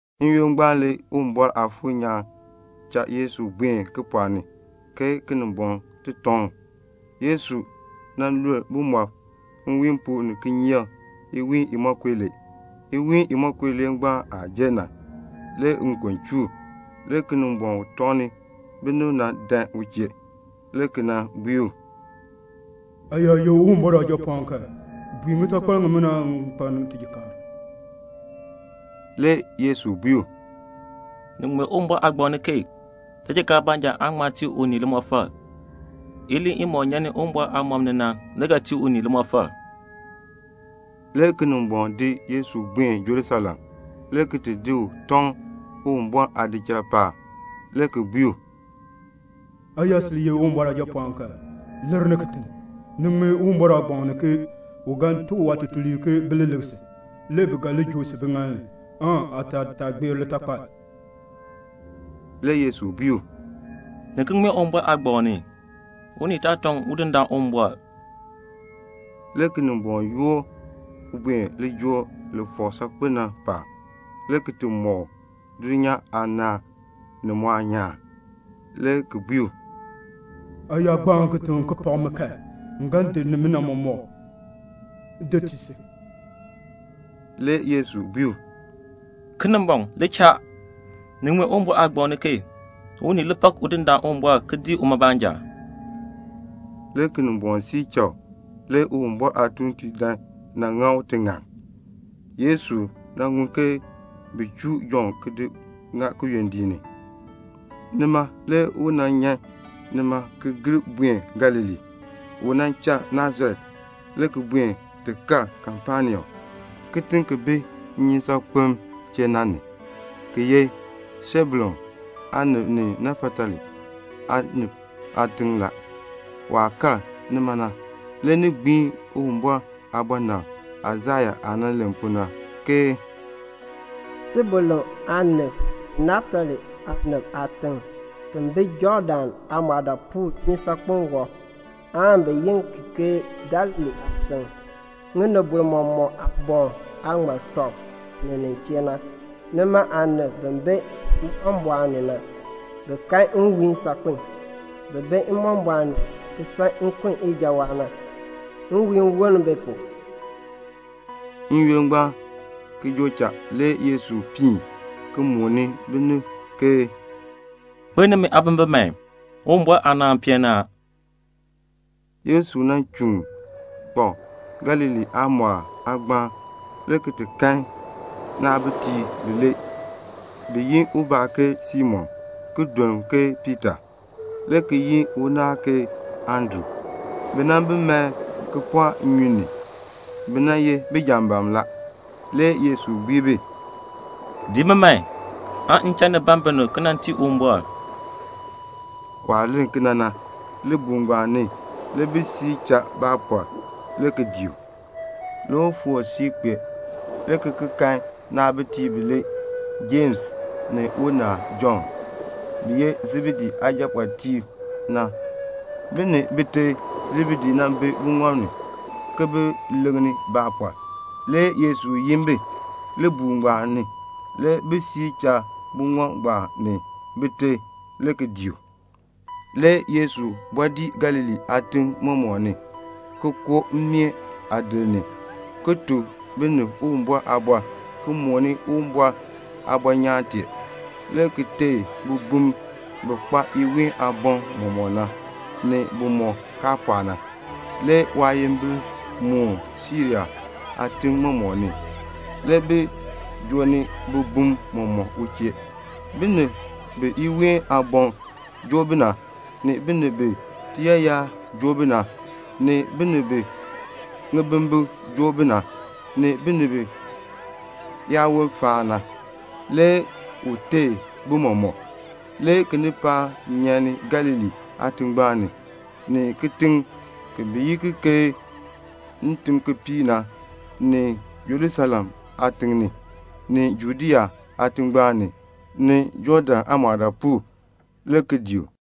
N-yoonn ngbaan le Uwumbɔr Aafuur nyaan cha Yesu buen kipɔɔk ni aan Kinimbɔŋ tɔŋ u. Le Yesu lul bumɔb nwiin pu ni kinyeek iwiin imonko ilee. Iwiin imonko ilee ngbaan aah jer na, le nkon chuu u. Le Kinimbɔŋ u tɔŋni binib na dan u chee, le ki nan bui u, "Aa yaa ye Uwumbɔr Aajapɔɔn kan, bui ŋitakpal ŋimina ŋi kpaln tijikaar." Le Yesu bui u, "Ni ŋmee Uwumbɔr Aagbaŋ ni ke 'Tijikaar baanja aan ŋma tii unii limɔfal. Iliin imɔk nyan ni Uwumbɔr aamɔb ni na le ga tii unii limɔfal."' Le Kinimbɔŋ di Yesu ki di buen Jerusalem, le ki di u tɔŋ Uwumbɔr aadichal paab, le ki bui u, "Aa yaa ye Uwumbɔr Aajapɔɔn kan, lir ni kitiŋ. Ni ŋmee Uwumbɔr Aagbaŋ ni ke 'U ga tuk waatuuntiib ke bi li lik si, le bi ga li joo si biŋaal ni, aataal taa gbeer litakpal."' Le Yesu bui u, "Ni ki ŋmee Uwumbɔr Aagbaŋ ni, 'Unii taa tɔŋ Udindaan Uwumbɔr."' Le Kinimbɔŋ ki yoor u ki di buen lijool li fɔk saakpen na paab, le ki mɔk u dulnyaa aanaan mɔmɔk, ni mu aanyaan, le ki bui u, "Aa yaa gbaan kitiŋ ki pak mi kan, m ga di nimina mɔmɔk ki tii si." Le Yesu bui u, "Kinimbɔŋ, li cha. Ni ŋmee Uwumbɔr Aagbaŋ ni ke 'Unii li pak Udindaan Uwumbɔr ki dii uma baanja."' Le Kinimbɔŋ siir cha u. Le Uwumbɔr aatuuntiib dan nan ŋa u tiŋann. Le Yesu ŋun ke bi chuu Jɔnn ki di ŋa kiyondiik ni. Nima na le u nyan nima ki gir buen Galilee. U cha Nasaret le ki buen ti kal Kapenaum, kitiŋ ki bi nnyusaakpem chee na. Ki ye Sebulun aanib ni Naftali aanib aatiŋ la. Waah kal nima na, le ni gbiin Uwumbɔr aabɔnabr Aisaya aah nan len pu na, ke "Sebulun aanib ni Naftali aanib aatiŋ, ki bi Jɔɔdan aamɔɔdaapuul, nnyusaakpem wɔb, bi yi ki ke Galilee aatiŋ, ŋinibol mɔmɔk aaboŋ aah ŋmar tɔb ponn ni nin chee na, Nima aanib bi bi mbɔmbɔɔn ni na, bi kan nwiihn saakpiin. Bin bi mbɔmbɔɔn ni, ki san nkun ijawaan na, le nwiihn woln bi pu." N-yoonn ngbaan ki joo cha le Yesu piin ki mooni binib, "Kpeln nimi aabimbin man. Uwumbɔr aanaan peen ni a." Le Yesu chuun kpak Galilee aamɔɔl aagbaan le ki ti kan naabitiib bilee, bi yi ubaa ke Simon ki duln u ke Piita, le ki yi unaal ke Andru. Bi nan bi mae kipɔɔk nnyun ni. Bi nan ye bijambaam la. Le Yesu bui bi, "Dii mi man, aan m cha ni ban binib ki nan tii Uwumbɔr." Waah len kena na, libuul ngbaan ni le bi di cha baapɔr le ki dii u. Le u foor siib ki kpee, le ki ki kan naabitiib bilee, Jems ni unaal Jɔnn, bi ye Sebedee aajapɔɔtiib na. Bi ni bite Sebedee bi buŋɔb ni, ki bi leŋni baapɔr. Le Yesu yin bi. Libuul ngbaan ni le bi cha buŋɔb ngbaan ni bite le ki dii u. Le Yesu bɔɔ dii Galilee aatim mɔmɔk, le ki koo mmeen aadir ni, ki tuk binib Uwumbɔr aaliin, ki mooni Uwumbɔr aanaan aabɔnyaan tee, le ki teei bibum bi kpa iween aaboŋ mɔmɔk na, ni bimɔk kaa pɔɔ na. Le waayimbil moon Siria aatim mɔmɔk ni. Le bi joo ni bibuliib mɔmɔk u chee, binib bi iween aaboŋ joo bi na, ni binib bi tiyaayar joo bi na, ni binib bi ŋibimbikr joo bi na, ni binib biyaawon faan na. Le u teei bi mɔmɔk. Le kinipaak nyan ni Galilee aatingbaan ni, ni kitiŋ bi yi ki ke Ntimkipiik ni, ni Jerusalem aatiŋ ni, ni Judea aatingbaan ni, ni Jɔɔdan aamɔɔdaapuul, le ki dii u.